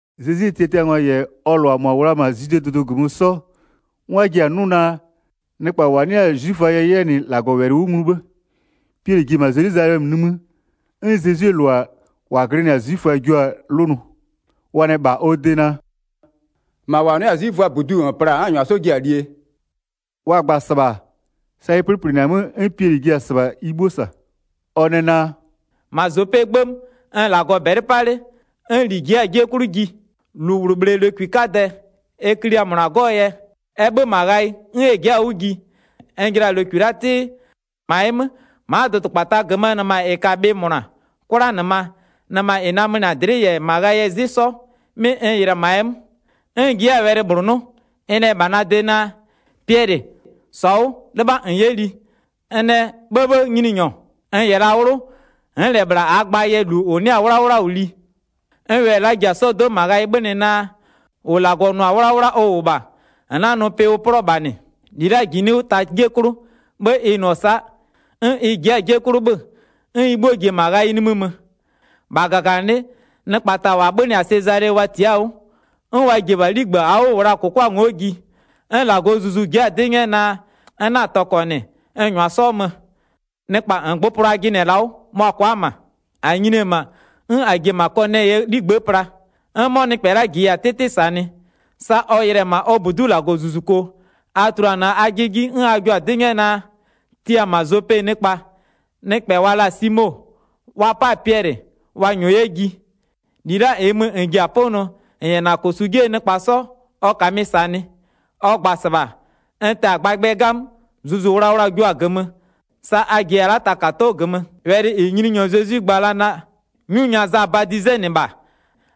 Zezwie tiatiangwa -yɛ ɔ -lʋa -mʋa -wʋ la-a -ma Zwidee dʋdʋ -gömö 'sɔ, 'n wa ji-a 'nʋ naa, nɩkpa -wa 'nɩ-a 'zwiföa yɛ 'yɛ -nɩ -Lagɔwɛlɩ 'wʋ nglu 'bhë. Piɛlɩ ji-e -ma Zelwizalɛmö nimï, 'n Zezwie -lʋa -wa glɩnɩ-a 'zwiföa jio-a 'lʋnʋ, wa nɛ -bha ɔ de naa: “-Ma -wa 'nɩ-a 'zwiföaa -buduu -n pla-a 'n -n -nyʋa 'sɔ ji-a liee?” Wa gba-a -sɩbha, sa ɩ 'plɩplɩnɩ-a 'mö 'n Piɛlɩ ji-e -sɩbha ɩ 'bhuo -sa. Ɔ nɛ naa: “-Ma Zopee 'gbë 'mö, n-n -Lagɔ -bɛlɩ 'pa 'le, 'n -li ji'i-a 'jie 'klʋ ji. -Lu -bhlʋ -bhlee lokwi 'kadɛ, ɛ klia -mʋna 'gɔ-ɔ yɛ, ɛ 'bhö-ö -ma ghayɩ 'n ɛ ji'i-a 'wʋ ji. N jɩla-a lokwi la'a 'tɩ, -ma ɛ 'mö, ma'a dʋdʋkpata -gömöö nɩma -ɩ ka-a bhɩ -mʋna, 'kwlanɩma, nɩma -ɩ namönɩa-a dlɩ'ɩ -yɛ -ma ghayɩɛ 'zɩ 'sɔ, 'mɩ n yɩlɩ-ɛ -ma ɛ 'mö. 'N n ji 'yɛ-a wɛlɩ -bhlʋ 'nʋ, ɩ nɛ -bha na de naa: Piɛlɩ, -Sɔ 'wʋ, 'lɩbha -n 'yɛ li. N nɛ, 'bhëbhë Nyininyɔ, n -yɛ la 'wlʋ, n'n -lɛ -bhla -aa gba -yɛ -lu -ʋ 'nɩ-a 'wlawla -wʋ li. 'N wɛlɩ la'a ji-a 'sɔdo'o -ma ghayɩ 'bhönɩ naa: -Ʋ la'a -Lagɔ nʋ-a 'wlawla ʋ -wʋ -bha, -n 'na-a nʋ pɩ ʋ 'plɔ-ɔ -bha -nɩ. 10-Li la'a -jinɩ'ɩ 'wʋ ta 'jie 'klʋ, 'bhë ɩ nʋ-ɔ sa'a, 'n ɩ ji'i-a 'jie 'klʋ 'bhö-ö, 'n ɩ 'bhuo ji-e -ma ghayɩ nimï mö. 11-Bha -gaganɩlɩ'ɩ, nɩkpa ta -wa 'bhönɩ-a Sezale wa tia'a-a 'wʋ, 'n wa ji-e -bha 'ligbë -aa 'wʋ n -wʋ laa -kʋkwa ngo'o ji. 'N -Lagɔɔ Zuzu ji'i-a 'dɩ 'nyɛ naa, n 'na-a tɔkɔ -nɩ, n -nyʋa 'sɔ mö. Nɩkpa -ngbʋpʋlʋ a jɩnɩ-ɛ la'a 'wʋ, mʋa-a kwa'a-a -ma. -A nyini-e -ma, 'n -a ji-e -ma Kɔnɛyɩɛ 'ligbë'ë pla. 'N 'mɔ nɩkpɛ la'a -jiya-a 'tɩtɩ -sanɩ. -Sa ɔ yɩlɩ-ɛ -ma ɔ -budu'u -Lagɔzuzuko, a tuluanɩɔ-a ajɩ 'ji 'n a jio-a 'dɩ 'nyɛ naa: Tia -ma Zope nɩkpa, nɩkpɛ wa la-a Simo, wa 'pa-a Piɛlɩ, wa -nyɔɔ 'yɛ ji. -Li la'a -ɩɩ mö -n ji-a 'pʋnʋɔ, -n -yɛ -na -kosu 'jie nɩkpa 'sɔ, ɔ -kamɩ -sanɩ. Ɔ gba-a -sɩbha, n tɛ-a gbagbɩɛ 'gamö, Zuzu Wlawla-a jua-a -gömö, sa a -jiya la'a takado'o -gömö. Wɛlɩ -ɩ Nyininyɔ Zezwi gba la-a naa: 'Nyu nya Za badizenɩ -bha,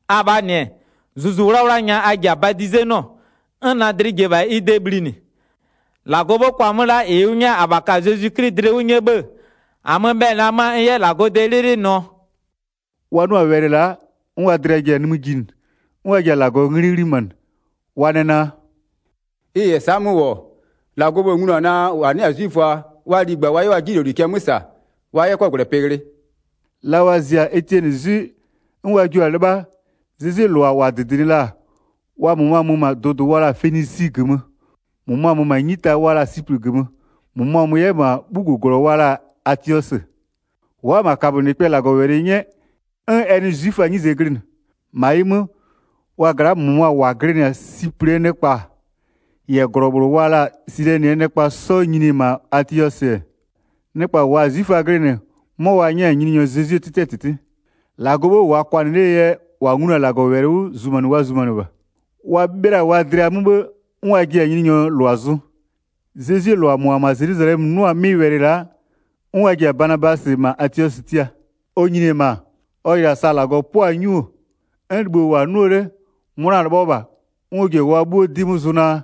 abhaa -nɩ-ɛ, Zuzu 'Wlawla nya a ji-a badizenɩɔ, 'n na dlɩ ji-e -bha ɩ de bhlinɩ. 17-Lagɔɔ 'bhë kʋa-a 'mö la'a -ɩ ʋ 'nyɛ-a -abha ka-a Zezwi 'Kli dlɩ 'wʋ 'nyɛ 'bhë-ë, -amö-ö bhɛlɩ la 'mö-a n 'yɛ -Lagɔɔ de 'lɩlɩlɩ nʋɔ?” Wa 'nʋ-a wɛlɩ la'a, 'n wa dlɩa ji-a nimï jinɩ, 'n wa ji-a -Lagɔɔ 'nglɩ 'ghlimanɩ. Wa nɛ naa: “Ɩ -yɛ sa'a 'mö -wʋ-ɔ, -Lagɔɔ 'bhë-ë nglu-a naa, -wa 'nɩ-a 'zwiföa wa ligba wa 'yɛ wa 'jinyloli cɛ 'mö -sa wa 'yɛ 'kɔgwlɛpɩ ghlɩ.” La wa zia-a Etiɛnɩ 'zwɩ 'n wa jio-a 'lɩbha, Zezwie -lʋa -wa -dɩdɩnɩ la-a, wa -mʋmʋa mö -ma dʋdʋ wa la-a Fenisi -gömö, -mʋmʋa mö -ma 'nyita wa la-a Siplɩ -gömö, -mʋmʋa mö 'yɛ -ma 'bhuguglɔ wa la-a Atiɔsɩ. Wa'a-a -ma kabönɩkpɛ -Lagɔwɛlɩ 'nyɛ 'n ɛ nɩ 'zwiföaa 'nyize glɩnɩ. 20-Ma ɩ 'mö, wa gla'aa -mʋmʋa -wa glɩnɩ-a Siplɩɛ nɩkpa -yɛ -glɔ -bhlʋ wa la-a Silɛnɩɛ nɩkpa 'sɔ nyini-e -ma Atiɔsɩ, nɩkpa -waa-a 'zwiföa glɩnɩ, 'mʋa wa 'nyɛ-a Nyininyɔ Zezwie 'tɩtɩɛ -tɩtɩ. 21-Lagɔɔ 'bhë -wʋʋa kwanɩ 'lee yɛ -wa nglu-a -Lagɔwɛlɩ 'wʋ zumanɩ wa zumanɩ -bha. Wa 'bhɩla-a wa dlɩa 'mö 'n wa ji-a Nyininyɔɔ -lʋa zʋ. Zezwie -lʋa -mʋa -wʋ-ɔ -ma Zelwizalɛmö 'nʋ-a 'mɩ wɛlɩ la'a, 'n wa ji-a Banabasɩ -ma Atiɔsɩ tia. Ɔ nyini-e -ma, ɔ yɩlɩ-a sa -Lagɔ 'pʋa-a 'nyu, 'n libho -wʋ-a 'nʋɔ 'le-e, 'mʋna 'lɩbhɔ -bha, 'n ɔ ji-a wa 'bhuo 'dɩ 'mö zʋ naa,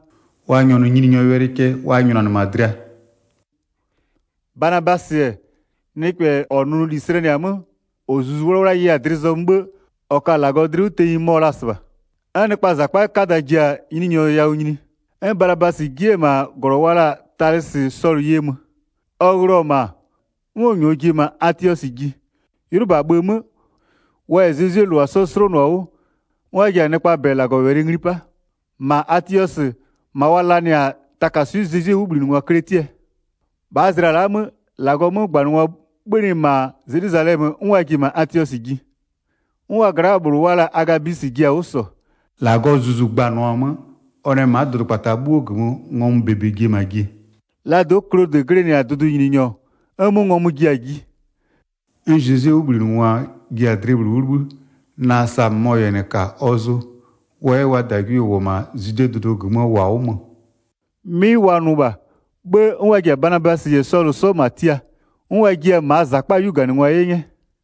wa nyɔnʋ Nyininyɔɔ wɛlɩ cɛ wa nyʋnanɩ -ma dlɩa. Banabasɩ-ɛ, nɩkpɛ -ɔɔ nʋnʋli slɛnɩ-a 'mö, -ɔ Zuzu 'Wlawla ye-a dlɩ zɔmö 'bhë -ɔ ka-a -Lagɔ dlɩ 'wʋ tenyi mɔ-ɔ la-a -sɩbha. 'N nɩkpaa -zakpaa 'kada ji-a Nyininyɔ yawʋ nyini. 'N Banabasɩ ji 'yɛ-ɛ -ma -glɔ wa la-a Talɩsɩ Sɔlʋ ye mö. Ɔ ghlɩɔ-ɔ -ma, 'n ɔ -nyɔɔ ji-e -ma Atiɔsɩ ji. 'Ylʋba bhë 'mö, wa -yɛ Zezwie -lʋa 'sɔ 'slonʋ-a 'wʋ, 'n wa ji-a nɩkpaa -bɛ -Lagɔwɛlɩ ngli 'pa. -Ma Atiɔsɩ, -ma wa lanɩ-a takaswɩ'ɩ Zezwie 'wʋbhlinɩngwa kletiɛ. -Lagɔgwie yɛ kwanɩkwanɩnɩ 27-Bhaa zlɩa la'aa 'mö, -Lagɔɔ 'mögbanɩngwa 'bhönɩ -ma Zelwizalɛmö 'n wa ji-e -ma Atiɔsɩ ji. 'N wa gla'aa -bhlʋ wa la-a Agabwisɩ ji-a 'wʋ -sɔ, -Lagɔɔ Zuzu gbanɩɔ-a 'mö, ɔ nɛ ma'a dʋdʋkpata 'bhuoo -gömö ngɔmʋ -bebe ji-e -ma jie. Laa do'o Klodɩ glɩnɩ-a dʋdʋnyininyɔ, 'n 'mʋ ngɔmʋ ji-a ji. 'N Zezwie 'wʋbhlinɩngwa ji-a dlɩ -bhlʋ 'wʋ 'libhï, naa sa -mʋmɔ -yɛ -nɩ -ka ɔ zʋ, wa 'yɛ wa -dagwie-e -wʋ-ɔ -ma Zwidee dʋdʋ -gömöö -wa 'wʋ mö. 'Mɩ wa nʋ -bha, 'bhë 'n wa ji-a Banabasɩ -yɛ Sɔlʋ 'sɔ -ma tia, 'n wa jiɩ-a -maa -zakpaa 'yuganɩngwa ye 'nyɛ.